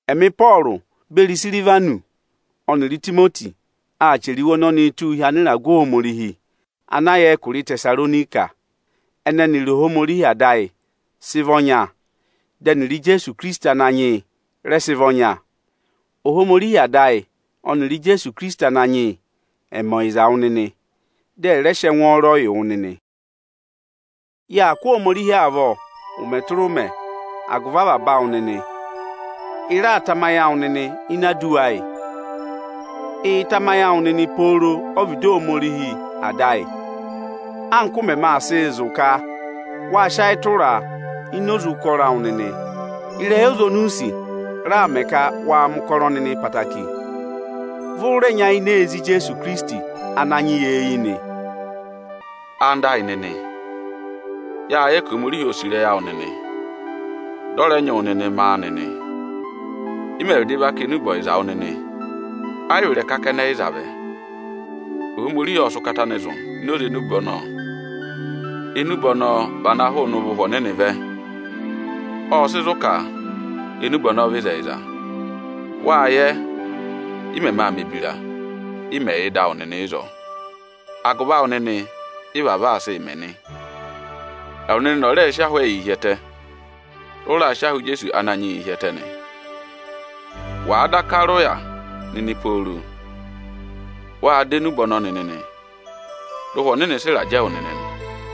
Ẹmị Ịpọọrụ beri Isirivanọsị ọnịrị Itimoti aa chẹrẹ iwe ọnọnịị tụ́ụ hi anịragụ Ohomorihi ana yà ẹkụra Ịtẹsaronika nị. Ẹnịrị Ohomorihi Ada ọnịrị Ijeesu Ikirisiti Ananyị yị ẹ sị vị ọnya. Ohomorihi Ada ayị ọnịrị Ijeesu Ikirisiti Ananyị yị ẹ mẹ ọyịza wụ nịnị, dị ẹ rẹ sị ẹngwọọrọ yị wụ nịnị! Yaa kụ́ Ohomorihi avọ ụmẹ tụra ụmẹ agụvị avaba awụ nịnị; ị raa tamayị awụ nịnị ini aduwa ayị. Ịị̄ tamayị awụ nịnị pooro ọ́vịdị Ohomorihi Ada ayị, anka ụ mẹmẹ aa sịị zụ̀ ka wáa sị ayị tụraa ini oze ụkọrọ awụ nịnị nị. Ịrẹyị ọza oni u sì raa mẹ ka waa mẹ̀ ụkọrọ nịnị ẹtẹẹtẹrẹ, vị ụ rẹ nyayịnẹ ee zí Ijeesu Ikirisiti Ananyị yị eyi nịnị. Ẹwụ nịnị ẹyịnyara amị, yáa yẹ ka Ohomorihi óo sì ịrẹyị awụ nịnị, dị ọ rẹ nyị wụ nịnị mẹ áanị nị. Ị mẹ̀ vịdị va kà enube ọyịza wụ nịnị, ayị vị ịrẹka kẹnẹ ị za vẹ. Ohomorihi ộ sị ụkata anị zụ̀ ini oze enube ọnọọ. Enube ọnọọ vị ana hụụnị ụvọ Ụhwẹ Ọnịnị vẹ. Ộ sị zụ̀ ka enube ọnọọ vị ịzẹyịza. Wáa yẹ, ị mẹmẹ aa mẹ̀ ebira, ị mẹ̀ yà ịdị awụ nịnị ịzọọ. Agụvị awụ nịnị ị vavọọ aa sịị mẹ nị. Ẹwụ nịnị ọ́ rẹ sị ahụ ẹyị hi ẹtẹ, dị ụ raa sị ahụ Ijeesu Ananyị yịị hi ẹtẹ nịnị nị. Wàa daka rị ụya nịnị pooro, wâ dọ enube ọnọọ nịnị, dị Ụhwẹ Ọnịnị sị ịrajẹ wụ nịnị nị.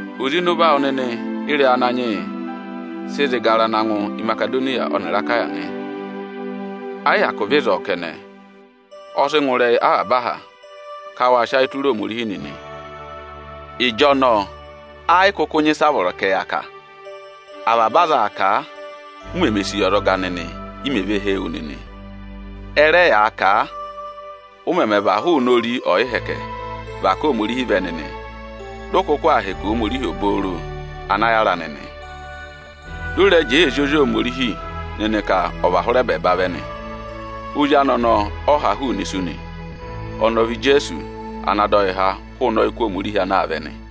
Oze ịnị ụvọ awụ nịnị ị́rẹyị Ananyị yị sị zị gara na ngụ Imasedoniya ọnịrị Akaya nị. Ẹ yị hyakụ vị ịzọọ kẹnẹ, ọ sị ngụ ịrẹyị avaba aha ka waa sị ayị tụra Ohomorihi nịnị. Ịjọnọọ ẹ yị kụkụ nyị ịsị a vọrọ ka ẹ yà kà. Avaba aza aa kà a, u meme sì yi ọzọga nịnị, i mè ve hee wu nịnị. Ẹ rẹ yaa kà a, ụ mẹmẹ và hụụnị ori ọyịhẹkẹ và ká Ohomorihi vẹ nịnị, dị ụ kụkụ aa hẹkẹ Ohomorihi obooro ana yára nịnị. Dị ụ rẹ jẹẹ ee zí Ozi Ohomorihi nịnị ka ọ̀ và hụrị ẹbẹẹba vẹ nị. Ozi anị ọnọọ ọ ha hụụnị isu nị. Ọnị ọ vị Ijeesu ana dọ yị há hụụnị ọyịkụ Ohomorihi ana aa vẹ nị.